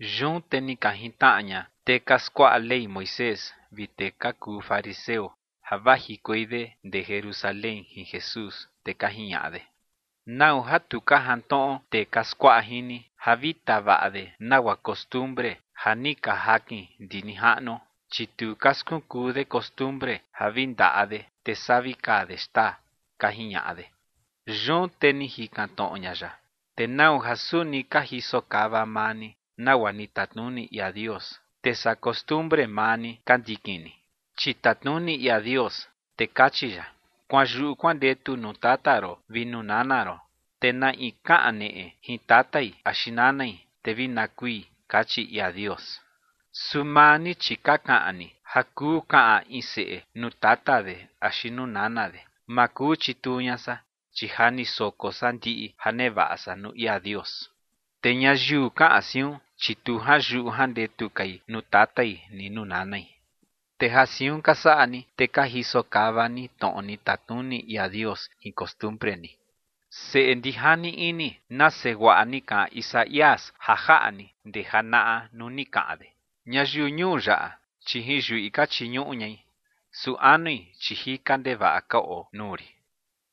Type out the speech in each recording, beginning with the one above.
Yun te ni ka jintnaꞌa ña tee ka skuaꞌa Ley Moisés vi tee ka kuu fariseo ja vajikuei de ndee Jerusalén jin Jesús, te ka jiñaꞌa de: ͏―͏¿Nau ja tu ka jantnoꞌo tee ka skuaꞌa jin ni, ja vi tavaꞌa de nagua costumbre ja ni ka jakin ndi nijaꞌnuo? Chi tu ka skunkuu de costumbre ja vi ndaꞌa de, te saa vi kaa de xtaa ͏―͏ka jiñaꞌa de. Yun te ni jikan tnoꞌo ña ya: ͏―͏¿Te nau ja suni ka jisokava maa ni nagua ni tatnuni ia Dios, te saa costumbre maa ni ka ndikin ni? Chi tatnuni ia Dios, te kachi ya: “Kuanyuꞌu kuandetu nuu tata ron vi nuu nana ron”, te “Na in kaꞌan neꞌe jin tatai axi nanai, te vi na kui” kachi ia Dios. Su maa ni, chi ka kaꞌan ni: “Ja kuu kaꞌan in seꞌe nuu tata de axi nuu nana de: Ma kuu chituu ña san, chi ja ni soko san ndiꞌi ja nevaꞌa san nuu ia Dios”. Te ñayiu kaꞌan siun, chi tu janyuꞌu jandetu kai nuu tatai ni nuu nanai. Te ja siun ka saꞌa ni, te ka jisokava ni tnoꞌo ni tatnuni ia Dios jin costumbre ni. Seꞌe ndijani ini, nase guaꞌa ni kaꞌan Isaías ja jaꞌa ni ndee janaꞌa nuu ni kaꞌan de: Ñayiu ñuu yaꞌa, chi jin yuꞌi ka chiñuꞌu ñai, su anui, chi jika ndevaꞌa ka oo nuu rin.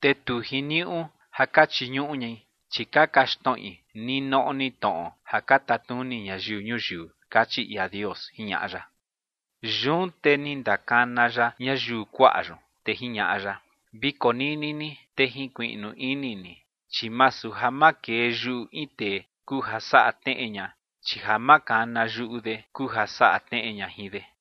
Te tu jiniuꞌu ja ka chiñuꞌu ñai, chi ka kaxtnoꞌi ninoꞌo ni tnoꞌo ja ka tatnuni ñayiu ñuyiu, kachi ia Dios ͏―͏jiñaꞌa ya. Yun te ni ndakana ya ñayiu kuaꞌa yun, te jiñaꞌa ya: ͏―͏Vi konini ni, te jinkuiꞌnu ini ni. Chi masu ja makee yuꞌu in tee kuu ja saꞌa tneꞌe ña, chi ja makana yuꞌu de kuu ja saꞌa tneꞌe ña jin de.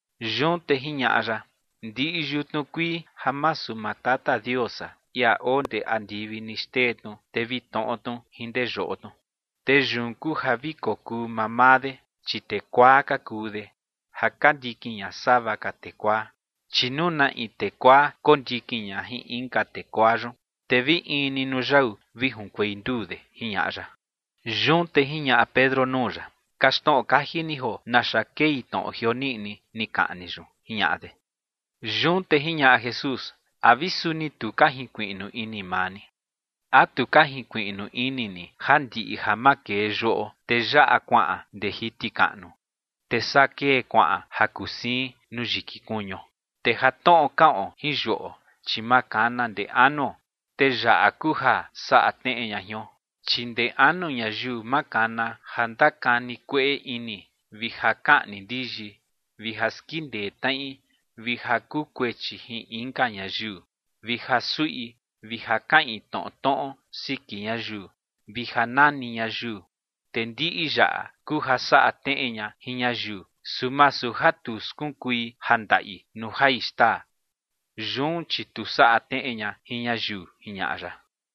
Yun te jiñaꞌa ya: ͏―͏Ndiꞌi yutnu kuii ja masu maa Tata Dios san, ia oo ndee andivi, ni xtee tnu, te vi tnoꞌo tnu jin ndee yoꞌo tnu. Te yun kuu ja vi kokuu maa maa de, chi tee kuaa ka kuu de ja ka ndikin ña sava ka tee kuaa. Chi nuu na in tee kuaa kondikin ña jin inka tee kuaa yun, te vi in ni nuu yau vi junkuei nduu de ͏―͏jiñaꞌa ya. Yun te jiñaꞌa Pedro nuu ya: ͏―͏Kaxtnoꞌo kaji ni joo naxa kei tnoꞌo jioniꞌni ni kaꞌan ni yun ͏―͏jiñaꞌa de. Yun te jiñaꞌa Jesús: ͏―͏¿A vi suni tu ka jinkuiꞌnu ini maa ni? ¿A tu ka jinkuiꞌnu ini ni ja ndiꞌi ja makee yuꞌo, te yaꞌa kuaꞌan ndee jiti kaꞌnu, te saa kee kuaꞌan ja kuu siin nuu yiki kuñuo? Te ja tnoꞌo kaꞌon jin yuꞌo, chi makana ndee anuo, te yaꞌa kuu ja saꞌa tneꞌe ña jion. Chi ndee anu ñayiu makana ja ndakani kueꞌe ini vi ja kaꞌni ndiyi, vi ja skindee tnaꞌi, vi ja kuu kuechi jin inka ñayiu, vi ja suꞌi, vi ja kaꞌin tnoꞌo tnoꞌo siki ñayiu, vi ja nani ñayiu. Te ndiꞌi yaꞌa kuu ja saꞌa tneꞌe ña jin ñayiu, su masu ja tu skunkui ja ndaꞌi nuu jai xtaa. Yun chi tu saꞌa tneꞌe ña jin ñayiu ͏―͏jiñaꞌa ya.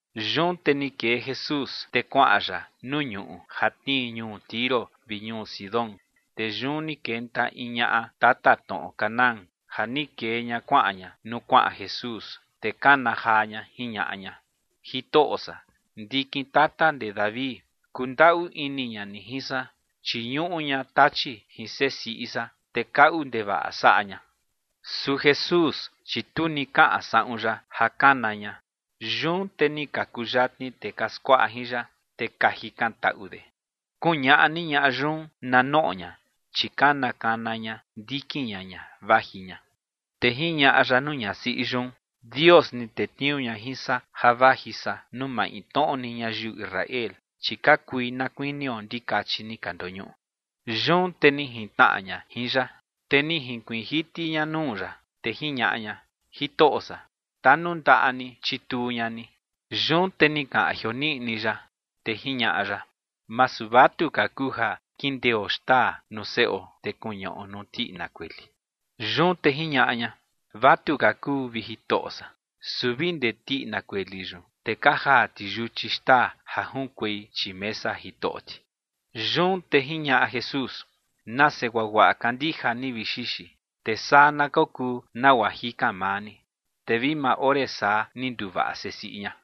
Yun te ni kee Jesús, te kuaꞌan ya nuu ñuꞌu ja tnii ñuu Tiro vi ñuu Sidón. Te yun ni kenta in ñaꞌa tatatnoꞌo Canaán ja ni kee ña kuaꞌan ña nuu kuaꞌan Jesús, te kana jaa ña jiñaꞌa ña: ͏―͏Jitoꞌo san, ndikin tata ndee David, kundaꞌu ini ña ni jin san, chi ñuꞌu ña tachi jin sesiꞌi san, te kaꞌu ndevaꞌa saꞌa ña. Su Jesús, chi tu ni kaꞌan saꞌun ya ja kana ña. Yun te ni ka kuyatni tee ka skuaꞌa jin ya, te ka jikantaꞌu de: ͏―͏Kuñaꞌa ni ñaꞌa yun na noꞌo ña, chi kana kana ña ndikin ña ña vaji ña. Te jiñaꞌa ya nuu ñasiꞌi yun: ͏―͏Dios ni tetniuu ña jin san ja vaji san nuu maintnoꞌo ni ñayiu Israel, chi ka kui na kuinio ndikachi ni ka ndoñuꞌu. Yun te ni jintnaꞌa ña jin ya, te ni jinkuiin jiti ña nuu ya, te jiñaꞌa ña: ͏―͏Jitoꞌo san, tanundaꞌa ni chituu ña ni. Yun te ni kaꞌan jioniꞌni ya, te jiñaꞌa ya: ͏―͏Masu vatuka kuu ja kindeo xtaa nuu seꞌo, te kuñaꞌo nuu tiꞌina kueli. Yun te jiñaꞌa ña: ͏―͏Vatuka kuu, vi Jitoꞌo san. Su vi ndee tiꞌina kueli yun, te ka jaa ti yuchi xtaa ja junkuei chii mesa jitoꞌo ti. Yun te jiñaꞌa Jesús: ͏―͏Nase guaguaꞌa kandija ni, vi xixi. Te saa na kokuu nagua jikan maa ni. Te vi maa ore saa ni nduvaꞌa sesiꞌi ña.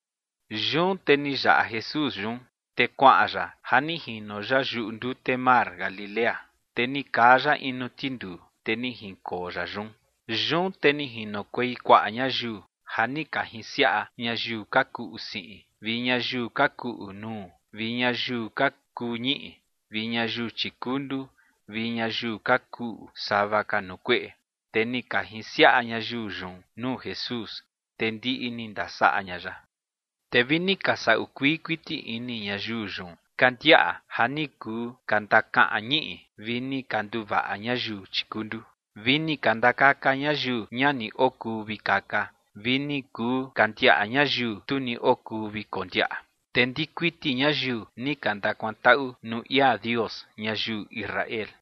Yun te ni yaꞌa Jesús yun, te kuaꞌan ya ja ni jino ya yuꞌu ndute mar Galilea. Te ni kaa ya in nuu tinduu, te ni jinkoo ya yun. Yun te ni jinokuei kuaꞌa ñayiu ja ni ka jinsiaꞌa ñayiu ka kuꞌu siꞌin vi ñayiu ka kuꞌu nuu vi ñayiu ka kuu ñiꞌi vi ñayiu chikundu vi ñayiu ka kuꞌu sava ka nuu kueꞌe. Te ni ka jinsiaꞌa ñayiu yun nuu Jesús, te ndiꞌi ni ndasaꞌa ña ya. Te vi ni ka saꞌu kuii kuiti ini ñayiu yun ka ndiaꞌa ja ni kuu ka ndakaꞌan ñiꞌi, vi ni ka nduvaꞌa ñayiu tikundu, vi ni ka ndakaka ñayiu ña ni okuu vi kaka, vi ni kuu ka ndiaꞌa ñayiu tu ni okuu vi kondiaꞌa. Te ndiꞌi kuiti ñayiu ni ka ndakuantaꞌu nuu ia Dios ñayiu Israel.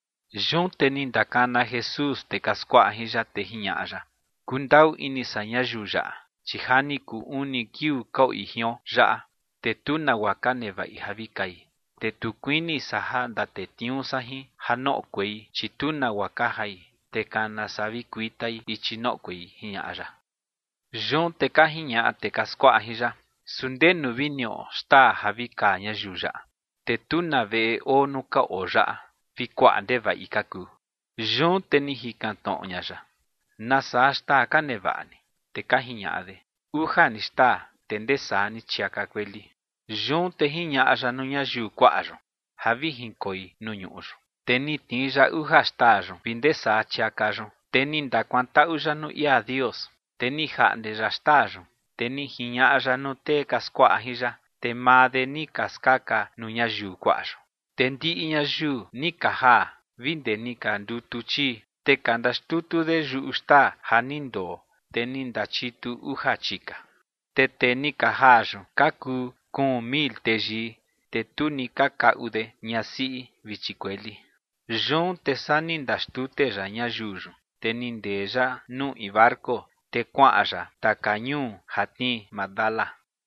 Yun te ni ndakana Jesús tee ka skuaꞌa jin ya, te jiñaꞌa ya: ͏―͏Kundaꞌu ini san ñayiu yaꞌa, chi ja ni kuu uni kiuu ka oi jion yaꞌa, te tu nagua ka nevaꞌi ja vi kai. Te tu kuini san ja ndatetniuu san jin ja noꞌokuei, chi tu nagua ka jai, te kana saa vi kuitai ichi noꞌokuei ͏―͏jiñaꞌa ya. Yun te ka jiñaꞌa tee ka skuaꞌa jin ya: ͏―͏¿Su ndenu vi niꞌo xtaa ja vi kaa ñayiu yaꞌa? Te tu na veꞌe oo nuu ka oo yaꞌa, vi kuaꞌa ndevaꞌi ka kuu. Yun te ni jikan tnoꞌo ña ya: ͏―͏¿Nasaa xtaa ka nevaꞌa ni? Te ka jiñaꞌa de: ͏―͏Uja ni xtaa, te ndee saa ni chiaka kueli. Yun te ni jiñaꞌa ya nuu ñayiu kuaꞌa yun ja vi jinkoi nuu ñuꞌu yun. Te ni tnii ya uja xtaa yun vi ndee saa chiaka yun, te ni ndakuantaꞌu ya nuu ia Dios, te ni jaꞌnde ya xtaa yun, te ni jiñaꞌa ya nuu tee ka skuaꞌa jin ya, te maa de ni ka skaka nuu ñayiu kuaꞌa yun. Te ndiꞌi ñayiu ni ka jaa vi ndee ni ka ndutu chii. Te ka ndaxtutu de yuꞌu xtaa ja ni ndoo, te ni ndachitu uja chika. Te tee ni ka jaa yun ka kuu kuun mil teyii, te tu ni ka kaꞌu de ñasiꞌi vi chikueli. Yun te saa ni ndaxtute ya ñayiu yun, te ni ndee ya nuu in barco, te kuaꞌan ya taka ñuu ja tnii Magdala.